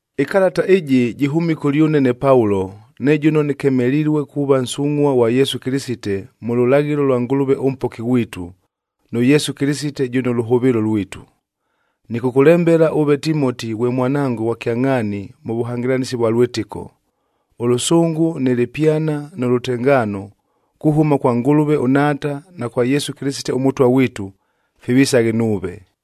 Ɨkalata ɨjɨ jɨhʉmile kʉlyʉne ne Paulo, ne jʉno nɨkemelilue kuuva nsungʼhua ghwa Yesu Kɨlɨsite mʉ lʉlaghɨlo lwa Ngʉlʉve ʉMpoki ghwitu, nʉ Yesu Kɨlɨsite jʉno lʉhʉvɨɨlo lwitu. Nɨkʉkʉlembela ʉve Timoti ghwe mwanango ghwa kyangʼhaani mʉ vʉhangɨlanɨsi vwa lwɨtɨko. Ʉlʉsʉngʉ nɨ lɨpyana nʉ lʉtengaano, kuhʉma kwa Ngʉlʉve ʉNhaata na kwa Yesu Kɨlɨsite ʉMʉtwa ghwitu, fivisaghe nuuve.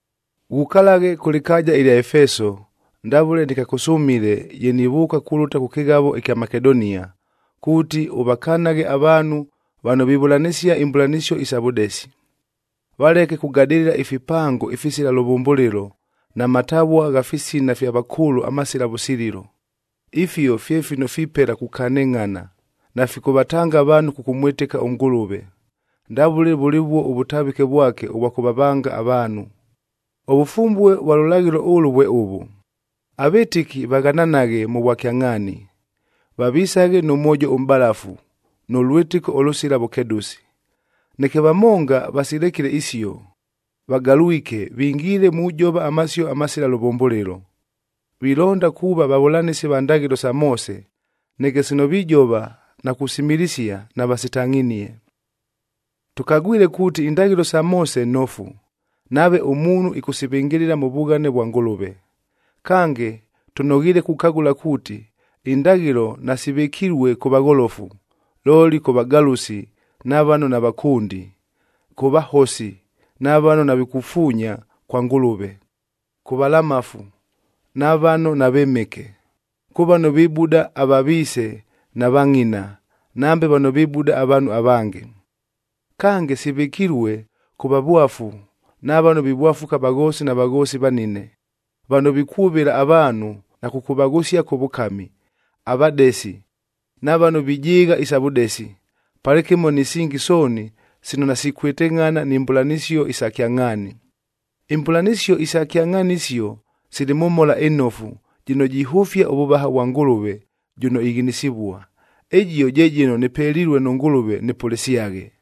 Ghukalaghe kʉ lɨkaaja ɨlya Efeso, ndavʉle nɨkakʉsʉmile ye nivʉʉka kulʉta kʉ kɨghavoa ɨkya Makedonia, kuuti ʉvakanaghe avaanhu vano vivʉlanɨsia imbʉlanɨsio isa vʉdesi. Valeke kugadɨlɨla ifipango ifisila lʉvʉmbʉlɨlo, na matavua gha fisina fya vakʉʉlʉ amasila vʉsililo. Ifio fye fino fipela kukanɨngʼhana, nafikʉvatanga avaanhu kʉkʉmwɨtɨka ʉNgʉlʉve, ndavʉle vʉlɨvuo ʉvʉtavɨke vwake ʉvwa kʉvavanga avaanhu. Ʉvʉfumbue vwa lʉlaghɨlo ʉlʉ vwe ʉvʉ: avɨtɨki vaghananaghe mʉ vwakyangʼhaani, vavisaghe nʉ mwojo ʉmʼbalafu, nʉ lwɨtɨko ʉlʉsila vʉkedʉsi. Neke vamonga vasilekile isio, vagalwike vingiile mujova amasio amasila lʉvʉmbʉlɨlo. Vilonda kuuva vavʉlanɨsi va ndaghɨlo sa Moose,b neke sino vijova na kusimilisia, navasitangʼhinie. Tʉkagwile kuuti indaghɨlo sa Moose nofu, nave ʉmuunhu ɨkʉsivɨngɨlɨla mʉ vughane vwa Ngʉlʉve. Kange, tʉnoghiile kukagʉla kuuti indaghɨlo nasivɨkilue kʉ vagholofu, looli kʉ vagalʉsi na vano navakʉndi, kʉ vahosi na vano navikufuunya kwa Ngʉlʉve, kʉ valamafu na vano navɨmɨke, kʉ vano vibuda ava viise na va ngʼina, nambe vano vibuda avaanhu avange. Kange, sivɨkilue kʉ vavwafu na vano vivwafuka avaghoosi na vaghoosi vanine, vano vikwʉvɨla avaanhu na kʉkʉvaghʉsia kʉ vʉkami, avadesi, na vano vijɨɨgha isa vʉdesi, palɨkɨmo ni singi sooni sino nasikwɨtɨngʼhana ni mbʉlanɨsio isa kyangʼhaani. Imbʉlanɨsio isa kyangʼhaani isio sili mʉ Mhola ɨNofu, jɨno jihʉfia ʉvʉvaha vwa Ngʉlʉve, jʉno ighinisivua. Ɨjio je jɨno nɨpelilue nʉ Ngʉlʉve nɨpʉlɨsyaghe.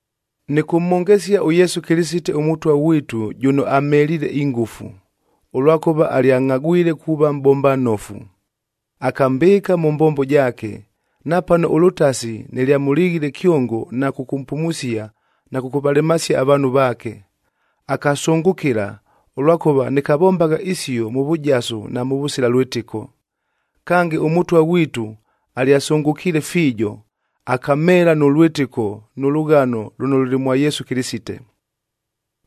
Nɨkʉmhongesia ʉYesu Kɨlɨsite ʉMʉtwa ghwitu jʉno amheliile ingʉfu, ʉlwakʉva alyangʼhagwile kuuva mʼbomba nnofu. Akambɨɨka mʉ mbombo jaake, napano ʉlʉtasi nɨlyamʉlighile kyongo na kʉkʉmpumusia na kʉkʉvalemasia avaanhu vaake. Akasʉngʉkɨla, ʉlwakʉva nɨkavombagha isio mʉ vʉjasu na mʉvʉsila lwɨtɨko. Kange, ʉMʉtwa ghwitu alyasʉngʉkiile fiijo, akamheela nʉ lwɨtɨko nʉ lʉghano lʉno lʉlɨ mwa Yesu Kɨlɨsite.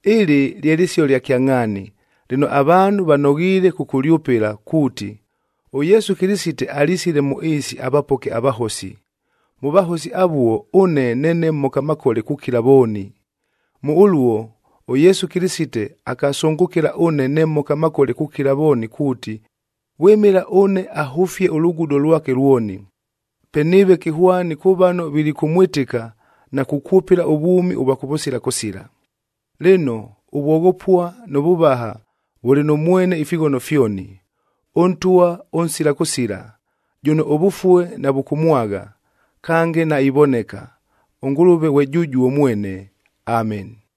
Ɨlɨ lye lɨsio lya kyangʼhaani, lɨno avaanhu vanoghiile kʉkʉlyʉpɨla kuuti, “ɄYesu Kɨlɨsite alisile mʉ ɨɨsi avapoke avahosi.” Mʉ vahosi avuo, ʉne neene mhoka makole kukila vooni. Mʉ ʉluo, ʉYesu Kɨlɨsite akasʉngʉkɨla ʉne ne mhoka makole kukila vooni kuuti, vwɨmɨla ʉne ahʉfie ʉlugudo lwake lwoni. Pe nɨɨve kɨhwani kʉ vano vilikʉmwɨtɨka na kukwʉpɨla ʉvwʉmi ʉvwa kʉvʉsila kʉsila. Lɨno, ʉvwoghopua nʉ vʉvaha vʉlɨ nʉ mwene ifighono fyoni, ʉNtwa ʉnsila kʉsila, jʉno ʉvʉfue navʉkʉmwagha, kange naivoneka, ʉNgʉlʉve ghwe jʉjuo mwene. Ameni.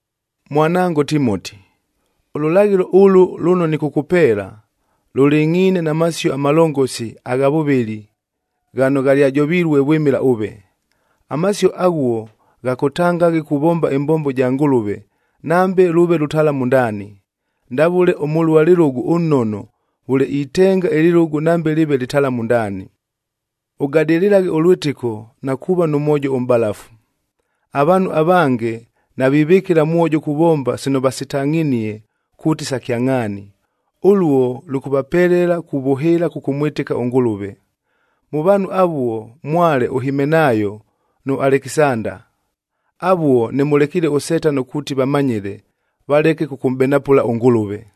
Mwanango Timoti, ʉlʉlaghɨlo ʉluo lʉno nɨkʉkʉpeela, lʉlɨngʼhiine na masio amalongosi agha vʉvɨli ghano ghalyajovilue vwɨmɨla ʉve. Amasio aghuo ghakʉtangaghe kuvomba ɨmbombo ja Ngʉlʉve nambe lʉʉve lʉtalamu ndaani, ndavʉle ʉmʉlua lɨlʉgʉ ʉnnono vʉle itenga ɨlɨlʉgʉ nambe lɨɨve lɨtalamu ndaani. Ʉgadɨlɨlaghe ʉlwɨtɨko na kuuva nʉ mwojo ʉmʼbalafu. Avaanhu avange navivɨkɨla mwojo kuvomba sino vasitangʼhinie kuuti sa kyangʼhaani, ʉluo lʉkʉvapelela kuvʉhɨɨla kʉkʉmwɨtɨka ʉNgʉlʉve. Mʉ vaanhu avuo mwale ʉHimenaayo,c nʉ Alekisanda. Avuo nɨmʉlekiile ʉSetano kuuti vamanyɨle, valeke kʉkʉmʼbenapʉla ʉNgʉlʉve.